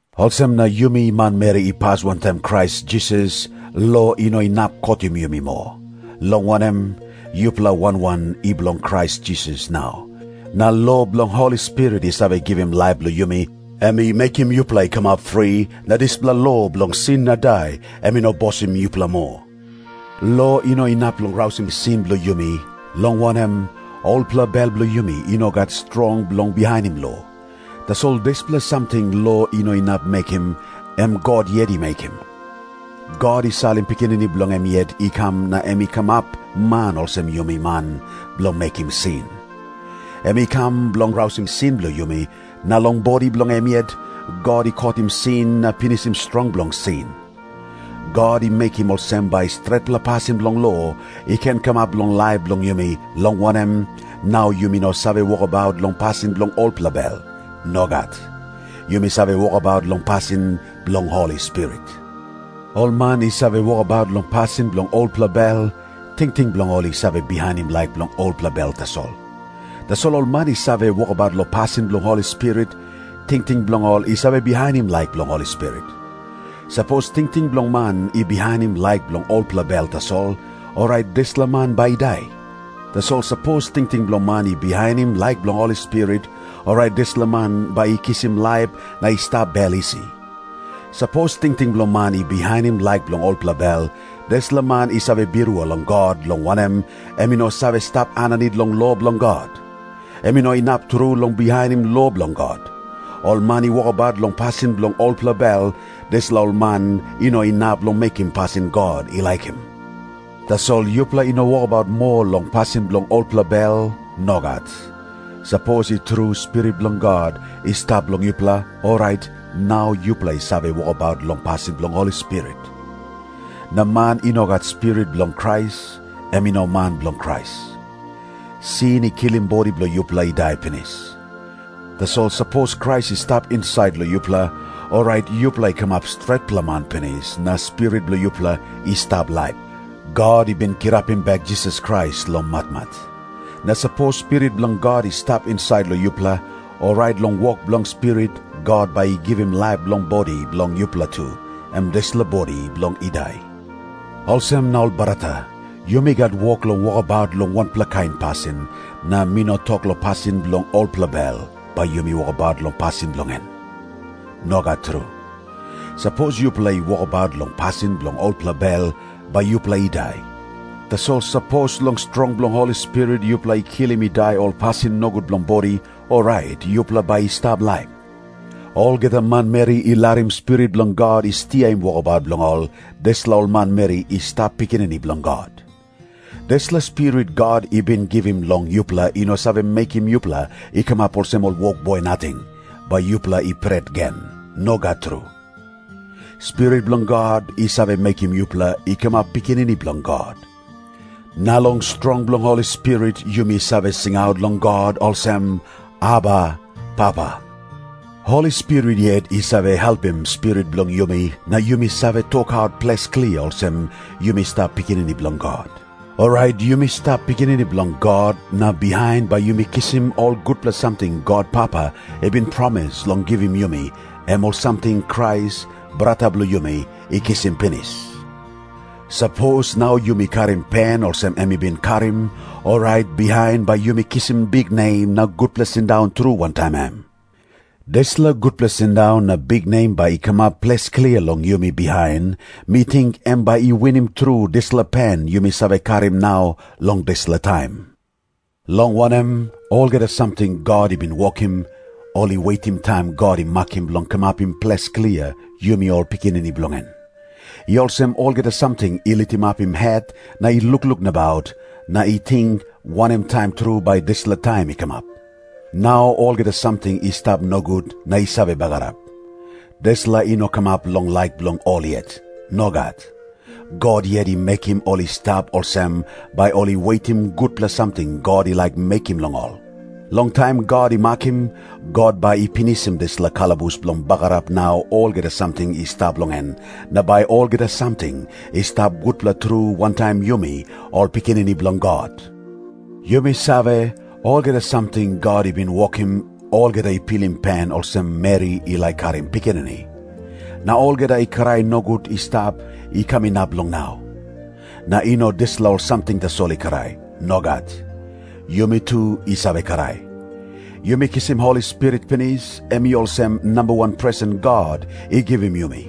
Olsem na yumi manmeri i pas wantaim Krais Jisas, lo i no inap kotim yumi moa. Long wanem, yupela wan wan i bilong Krais Jisas nau, na lo bilong Holi Spirit i save givim laip long yumi, em i mekim yupela i kamap fri, na dispela lo bilong sin na dai em i no bosim yupela moa. Lo i no inap long rausim sin bilong yumi, long wanem, olpela bel bilong yumi i no gat strong bilong bihainim lo. Tasol dispela samting lo i no inap mekim, em God yet i mekim. God i salim Pikinini bilong em yet i kam na em i kamap man olsem yumi man bilong mekim sin. Em i kam bilong rausim sin bilong yumi, na long bodi bilong em yet, God i kotim sin na pinisim strong bilong sin. God i mekim olsem bai stretpela pasin bilong lo i ken kamap long laip bilong yumi, long wanem, nau yumi no save wokabaut long pasin bilong olpela bel. Nogat. Yumi save wokabaut long pasin bilong Holi Spirit. Ol man i save wokabaut long pasin bilong olpela bel, tingting bilong ol i save bihainim laik bilong olpela bel tasol. Tasol ol man i save wokabaut long pasin bilong Holi Spirit, tingting bilong ol i save bihainim laik bilong Holi Spirit. Sapos tingting bilong man i bihainim laik bilong olpela bel tasol, orait dispela man bai i dai. Tasol sapos tingting bilong man i bihainim laik bilong Holi Spirit, orait dispela man bai i kisim laip na i stap bel isi. Sapos tingting bilong man i bihainim laik bilong olpela bel, dispela man i save birua long God, long wanem, em i no save stap aninit long lo bilong God. Em i no inap tru long bihainim lo bilong God. Ol man i wokabaut long pasin bilong olpela bel, dispela ol man i no inap long mekim pasin God i laikim. Tasol yupela i no wokabaut moa long pasin bilong olpela bel. Nogat. Sapos i tru Spirit bilong God i stap long yupela, orait nau yupela i save wokabaut long pasin bilong Holi Spirit. Na man i no gat Spirit bilong Krais, em i no man bilong Krais. Sin i kilim bodi bilong yupela i dai pinis. Tasol sapos Krais i stap insait long yupela, orait yupela i kamap stretpela man pinis, na spirit bilong yupela i stap laip. God i bin kirapim bek Jisas Krais long matmat. Na sapos Spirit bilong God i stap insait long yupela, orait long wok bilong Spirit God bai i givim laip long bodi bilong yupela tu, em dispela bodi bilong i dai. Olsem na ol brata, yumi gat wok long wokabaut long wanpela kain pasin, na mi no tok long pasin bilong olpela bel, bai yumi wokabaut long pasin bilong en. Nogat tru. Sapos yupela i wokabaut long pasin bilong olpela bel, bai yupela i dai. Tasol sapos long strong bilong Holi Spirit yupela i kilim i dai ol pasin nogut bilong bodi, orait yupela bai i stap laip. Olgeta manmeri i larim Spirit bilong God i stiaim wokabaut bilong ol, dispela ol manmeri i stap pikinini bilong God. Dispela Spirit God i bin givim long yupela i no save mekim yupela i kamap olsem ol wokboi nating, bai yupela i pret gen. Nogat tru. Spirit bilong God i save mekim yupela i kamap pikinini bilong God. Na long strong bilong Holi Spirit yumi save singaut long God olsem, “Aba, Papa.” Holi Spirit yet i save helpim spirit bilong yumi na yumi save tokaut ples klia olsem yumi stap pikinini bilong God. Orait yumi stap pikinini bilong God, na bihain bai yumi kisim ol gutpela samting God Papa i bin promis long givim yumi, em ol samting Krais, brata bilong yumi, i kisim pinis. Sapos nau yumi karim pen olsem em i bin karim, orait bihain bai yumi kisim biknem na gutpela sindaun tru wantaim em. Dispela gutpela sindaun na biknem bai i kamap ples klia long yumi bihain, mi ting em bai i winim tru dispela pen yumi save karim nau long dispela taim. Long wanem, olgeta samting God i bin wokim, ol i wetim taim God i makim bilong kamapim ples klia yumi ol pikinini bilong en. I olsem olgeta samting i litimapim het na i lukluk nabaut, na i ting, wanem taim tru bai dispela taim i kamap. Nau olgeta samting i stap nogut na i save bagarap. Dispela i no kamap long laik bilong ol yet. Nogat. God yet i mekim ol i stap olsem, bai ol i wetim gutpela samting God i laik mekim long ol. Long taim God i makim, God bai i pinisim dispela kalabus bilong bagarap nau olgeta samting i stap long en, na bai olgeta samting i stap gutpela tru wantaim yumi ol pikinini bilong God. Yumi save, olgeta samting God i bin wokim, olgeta i pilim pen olsem meri i laik karim pikinini. Na olgeta i krai nogut i stap, i kam inap long nau. Na i no dispela ol samting tasol i krai. Nogat. Yumi tu i save krai. Yumi kisim Holi Spirit pinis, em i olsem namba wan presen God i givim yumi.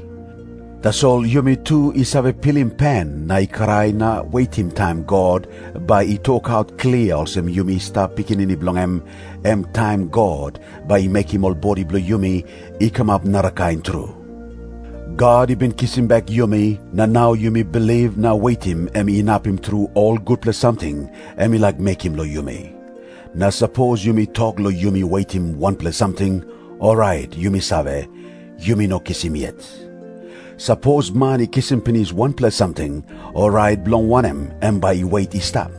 Tasol yumi tu i save pilim pen na i krai na wetim taim God bai i tokaut klia olsem yumi i stap pikinini bilong en, em taim God bai i mekim ol bodi bilong yumi i kamap narakain tru. God i bin kisim bek yumi, na nau yumi bilip na wetim em inapim tru ol gutpela samting em i laik mekim long yumi. Na sapos yumi tok long yumi wetim wanpela samting, orait yumi save, yumi no kisim yet. Sapos man i kisim pinis wanpela samting, orait bilong wanem em bai i wet i stap?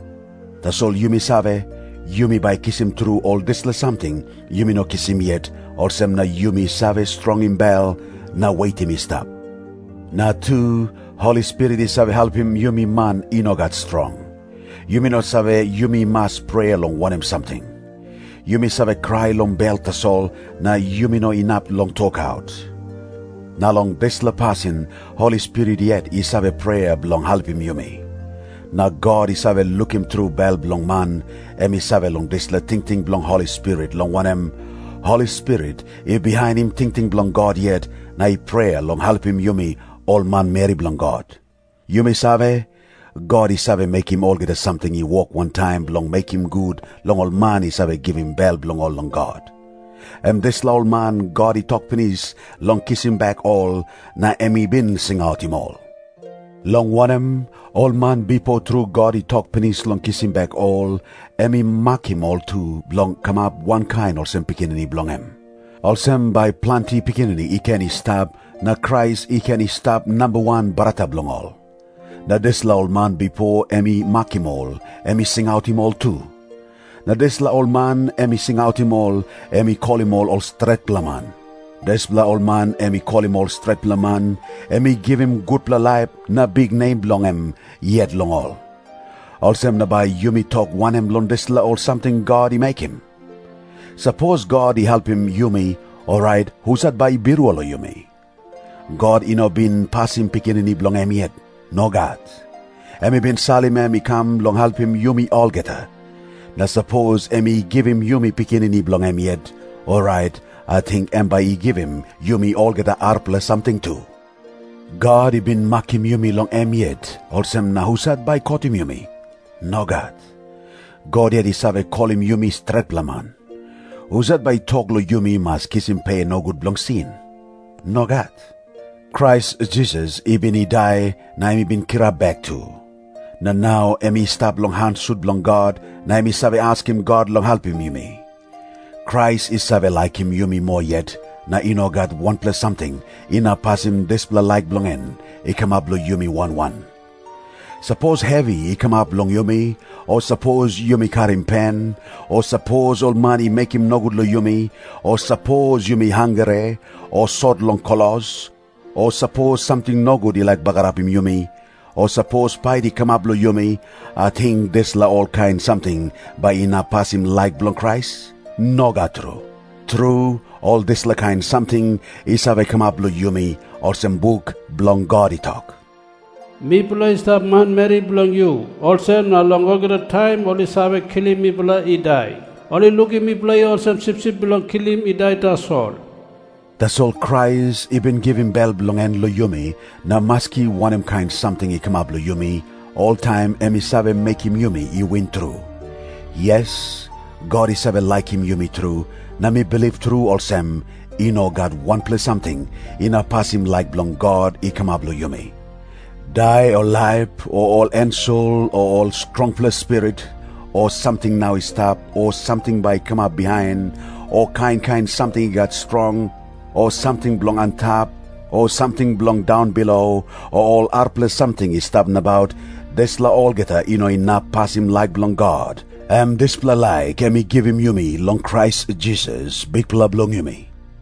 Tasol yumi save, yumi bai kisim tru ol dispela samting yumi no kisim yet, olsem na yumi save strongim bel na wetim i stap. Na tu, Holi Spirit i save helpim yumi man i no gat strong. Yumi no save yumi mas prea long wanem samting. Yumi save krai long bel tasol, na yumi no inap long tokaut. Na long dispela pasin Holi Spirit yet i save prea bilong helpim yumi. Na God i save lukim tru bel bilong man, em i save long dispela tingting bilong Holi Spirit, long wanem, Holi Spirit i bihainim tingting bilong God yet na i prea long helpim yumi ol manmeri bilong God. Yumi save, God i save mekim olgeta samting i wok wantaim bilong mekim gut long ol man i save givim bel bilong ol long God. Em dispela ol man God i tok pinis long kisim bek ol, na em i bin singautim ol. Long wanem, ol man bipo tru God i tok pinis long kisim bek ol, em i makim ol tu, bilong kamap wankain olsem Pikinini bilong em. Olsem bai planti pikinini i ken i stap, na Krais i ken i stap namba wan brata bilong ol. Na dispela ol man bipo em i makim ol, em i singautim ol tu. Na dispela ol man em i singautim ol, em i kolim ol stretpela man. Dispela ol man em i kolim ol stretpela man, em i givim gutpela laip na biknem bilong em yet long ol. Olsem na bai yumi tok wanem long dispela ol samting God i mekim? Sapos God i helpim yumi, orait husat bai i birua long yumi? God i no bin pasim Pikinini bilong em yet. Nogat. Em i bin salim em i kam bilong helpim yumi olgeta. Na sapos em i givim yumi Pikinini bilong em yet, orait ating em bai i givim yumi olgeta arapela samting tu. God i bin makim yumi bilong em yet, olsem na husat bai i kotim yumi? Nogat. God yet i save kolim yumi stretpela man. Husat bai i tok long yumi mas kisim pe nogut bilong sin? Nogat. Krais Jisas i bin i dai, na em i kirap bek tu. Na nau em i stap long han sut bilong God, na em i save askim God long helpim yumi. Krais i save laikim yumi moa yet, na i no gat wanpela samting inap pasim dispela laik bilong en i kamap long yumi wan wan. Sapos hevi i kamap long yumi, o sapos yumi karim pen, o sapos ol man i mekim nogut long yumi, o sapos yumi hangre, o sot long klos, o sapos samting nogut i laik bagarapim yumi, o sapos pait i kamap long yumi, ating dispela olkain samting bai i inap pasim laik bilong Krais? Nogat tru. Tru, ol dispela kain samting i save kamap long yumi, olsem buk bilong God i tok, “Mipela i stap manmeri bilong yu, olsem na long olgeta taim ol i save kilim mipela i dai. Ol i lukim mipela i olsem sipsip bilong kilim i dai tasol.” Tasol Krais i bin givim bel bilong en long yumi, na maski wanem kain samting i kamap long yumi, oltaim em i save mekim yumi i win tru. Yes, God i save laikim yumi tru, na mi bilip tru olsem, i no gat wanpela samting inap pasim laik bilong God i kamap long yumi. Dai o laip, o ol ensel o ol strongpela spirit, o samting nau i stap o samting bai i kamap bihain, o kain kain samting i gat strong, o samting bilong antap o samting bilong daunbilo, o ol arapela samting i stap nabaut, dispela olgeta i no inap pasim laik bilong God, em dispela laik em i givim yumi long Krais Jisas, Bikpela bilong yumi.